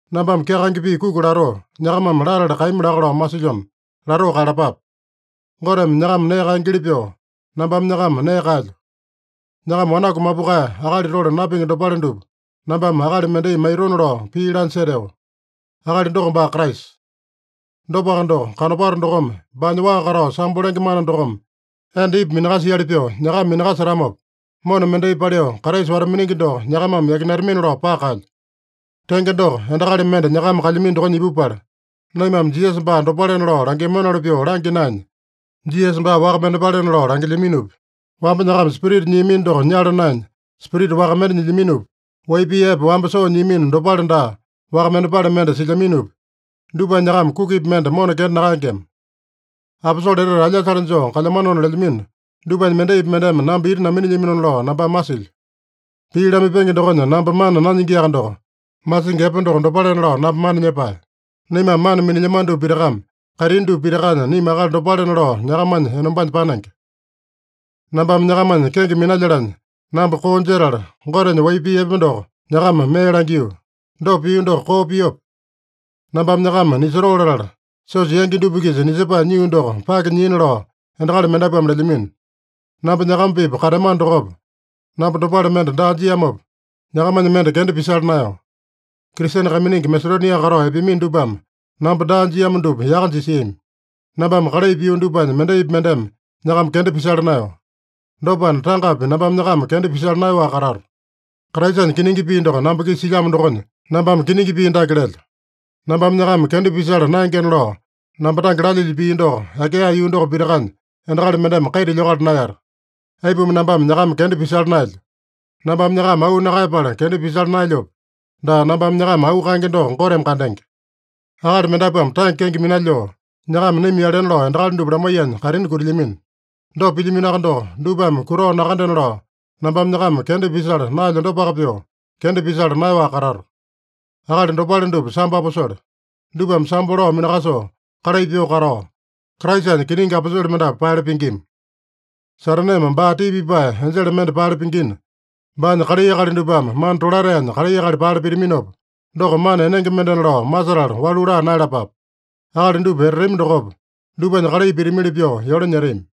Nambame kyakaenge pii kuki latoo, nyakamame latale kaeyami laka lao masilyona, latoo kaeyalapape. Goteme nyakama nee kaengeli pyoo, nambame nyakama nee kaelyo. Nyakama wanaku mapukae, akali tole napingi dopale dupa nambame akali mendai maitona lao pii lanya seteo. Akali doko baa Kraisa. Dopaka doko, kanopato dokome baanya waa katao sambo lenge mana dokome enda Ipa minakasiali pyoo nyakama minakasetamopa, mona mendai paliu Kraisa wata-miningi doko nyakamame yakinatamini-lao paka kaelyo. Tenge doko, endakali mende nyakama kalyamino dokonya ipupala, naimame Jisasa baa dopalena lao langiamanoli pyoo langya naenya, Jisasa baa waka mendepalena lao langilyaminopi, wamba nyakama Spirita nyiamino doko nyala naenya, spirita waka mende nyilyaminopi, wai pii epe wamba soo nyiamino dopale daa, waka mendepale mende silyaminopi, dupanya nyakama kukipi mende mona kenda nakaengema. Aposole etete alyasale joo kalyamanona lelyamino dupanya mendaipi mendeme namba ita naminilyamona lao nambame masilyo. Pii lamaipenge dokonya namba mana nanyingiaka doko, masingi epe doko dopalena lao namba mana nyepae. Naimame mana minilyamano dupa pitakame kaitini dupa pitakanya naima akali dopalena lao nyakamanya enombanya panenge. Nambame nyakamanya kenge minalyalanya, namba koo jetala, Gotenya wai pii epe doko nyakama mee langio. Dopa pio doko koo piope? Nambame nyakama nisotoo latala, siosa yangi dupa-kisa nisepae nyio doko pake nyiina lao endakali mendapuame lelyamino. Namba nyakama-pipa kateamano dokopa, namba dopale mende daa jiamopa, nyakamanya mende kenda pisala naeyo. Kristene kaiminingi Masedonia katao epeamino dupame namba daa jiamo dupa yaka jisiami. Nambame kalai pio dupanya mendaipi mendeme nyakama kenda pisala naeyo. Dopana, tangapi nambame nyakama kenda pisala naeyaowaka katato. Kraisanya kiningi pii doko namba-kisa silyamo dokonya, nambame kiningi pii dake lelyo: Nambame nyakama kenda pisala naengena lao namba tange lalyilyo pii doko Akaeya yuu doko pitakanya endakali mendeme kaita lyokala naeyata. Aipuma nambame nyakama kenda pisala naelyo? Nambame nyakama auu nakaeyapala kenda pisala naelyope? Daa, nambame nyakama auu kaenge doko Goteme kandenge. Akali mendapuame tange kenge minalyoo, nyakama naima-yalena lao endakali dupa lamaiyanya kaitini kutilyamino. Dopa pilyaminoaka doko, dupame kutao nakandena lao nambame nyakama kenda pisala naelyo dopaka pyoo, kenda pisala naeyaowaka katato. Akali dopale dupa sambo aposole. Dupame sambo lao minakasoo kalai pyoo katao, Kraisanya kiningi aposole mendapu paele pingima. Sataneme baa tii pipae enjele mende paele pingina, baanya kalai akali dupame mana tolataenya kalai akali paele pitaminopa, doko mana enenge mendena lao masetala walu laa naeyalapape. Akali dupa etatami dokopa, dupanya kalai pitamili pyoo yole nyetami.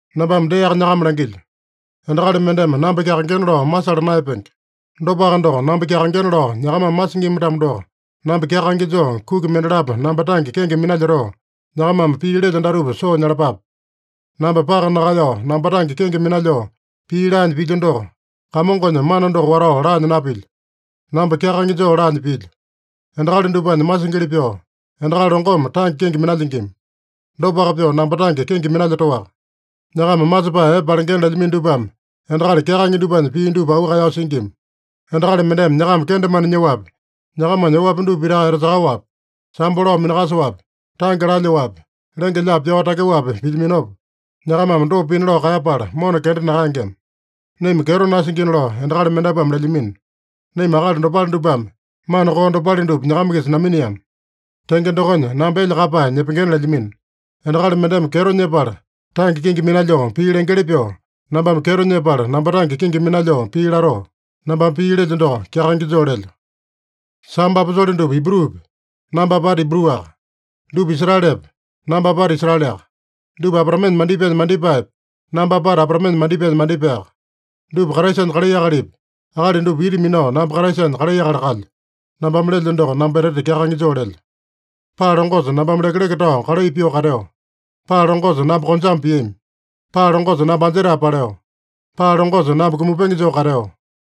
Nambame deaka nyakama langilyo: Endakali mendeme namba kyakaengena lao masala naeyapenge. Dopaka doko, namba kyakaengena lao nyakamame masingima-tamo doko, namba kyakaenge joo kuki mendalapo namba tange kenge minalyotoo, nyakamame pii lelyo datupa soo nyalapape. Namba paka nakaeyao namba tange kenge minalyoo pii laanya pilyo doko, Kamongonya mana doko watao laanya napilyo. Namba kyakaenge joo laanya pilyo. Endakali dupanya masingili pyoo, endakali longome tange kenge minalyingima. Dopaka pyoo namba tange kenge minalyotoaka. Nyakama masepae epe palengena lelyamino dupame endakali kyakaenge dupanya pii dupa auu kaeyao singima. Endakali mendeme nyakama kendemane nyoapi, nyakamanya oapi dupa pitaka etasakaowapi, sambo lao minakasoapi, tange lalyoapi, lenge-lyaapi pyao takyoapi pilyaminopa, nyakamame dopa pina lao kaeyapala mona kenda nakaengema. Naima kyeto nasingina lao endakali mendapuame lelyamino. Naima akali dopale dupame mana koo dopale dupa nyakama-kisa naminiama. Tenge dokonya, namba elya kaeyapae nyepengena lelyamino. Endakali mendeme kyeto nyepala, tange kenge minalyoo pii lengeli pyoo, nambame kyeto nyepala namba tange kenge minalyoo pii latoo. (Nambame pii lelyo doko, kyakaenge joo lelyo.) Sambo aposole dupa Ibrupi? Namba apata Ibruaka. Dupa Israelepe? Namba apata Israeleaka. Dupa Abraamenya mandipaenya mandipaepe? Namba apata Abraamenya mandipaenya mandipaeyaka. Dupa Kraisanya kalai akalipi? Akali dupa ita minao namba Kraisanya kalai akali kalyo. (Nambame lelyo doko, namba etete kyakaenge joo lelyo.) Paa longosa nambame lekeleke tao kalai pyoo kateo. Paa longosa namba konjame piami. Paa longosa namba anjetae paleo. Paa longosa namba kumapenge joo kateo.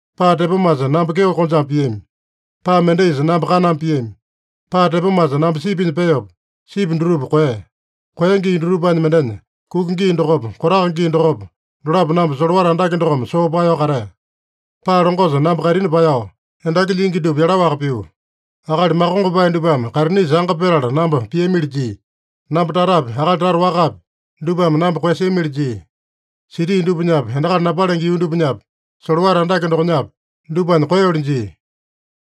Paa tepomasa namba kyeo konjame piami. Paa mendaisa namba kaname piami. Paa tepomasa namba sipinya peopa, sipi dutupa koeya. Koeya gii dutupanya mendenya, kuka gii dokopa, kotaka gii dokopa, dolapo namba solowata andake dokome soo paeyao katea. Paa longosa namba kaitini paeyao, endaki lyingi dupa yalaowaka pio. Akali makongopae dupame kaitinisa anga petala namba piamili jia. Namba tatapi, akali tata wakapi, dupame namba koeyasiamili jia. Siti dupanyapi, endakali napalenge yuu dupanyapi, solowata andake dokonyapi, dupanya koeyoli jia.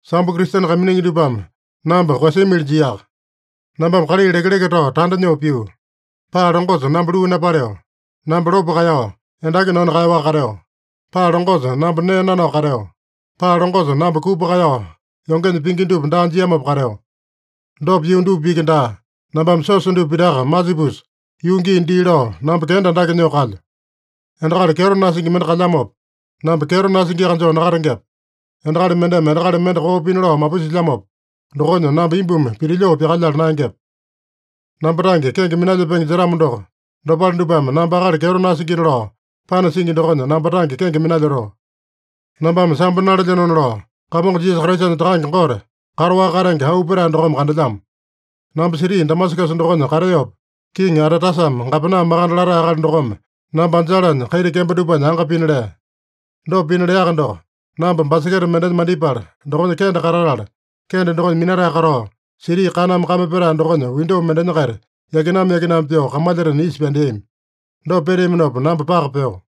Sambo Kristene kaiminingi dupame namba koeyasiamili jiaka. Nambame kalai lekeleke tao tanda nyoo pio. Paa longosa namba luu napaleo. Namba lopo kaeyao, endaki nanu kaeyaowaka kateo. Paa longosa namba nee nanao kateo. Paa longosa namba kupa kaeyao yongenya pingi dupa daa jiamopa kateo. Dopa pio dupa iki daa, nambame siosa dupa pitaka masipusa, yuu gii dii lao namba kenda andake nyoo kalyo. Endakali kyeto nasingi mende kalyamopa, namba kyeto nasingiaka joo nakatengepe? Endakali mendeme endakali mende koo pina lao mapusilyamopa, dokonya namba imbumi pitilyoo pyakalyala naengepe? Namba tange kenge minalyepenge jetamo doko, dopale dupame namba akali kyeto nasingina lao panasingi dokonya namba tange kenge minalyotoo. Nambame sambo nalelyenona lao Kamongo Jisasa Kraisanya Takange Gote, kataowaka katenge auu petae dokome kandelyamo. Namba siti Damasakasa dokonya kateopa, Kiŋi Atetasame gapena makande latae akali dokome namba anjalanya kaita kembo dupanya anga pina lea. Dopa pina leaka doko, namba baseketa mendenya mandipala, dokonya kende katatala, kende dokonya minatae katao, siti kaname kame petae dokonya windo mendenya-kaita yakinama-yakinama pyoo kamalyatena isa pyandeami. Dopa peteaminopa namba paka peo.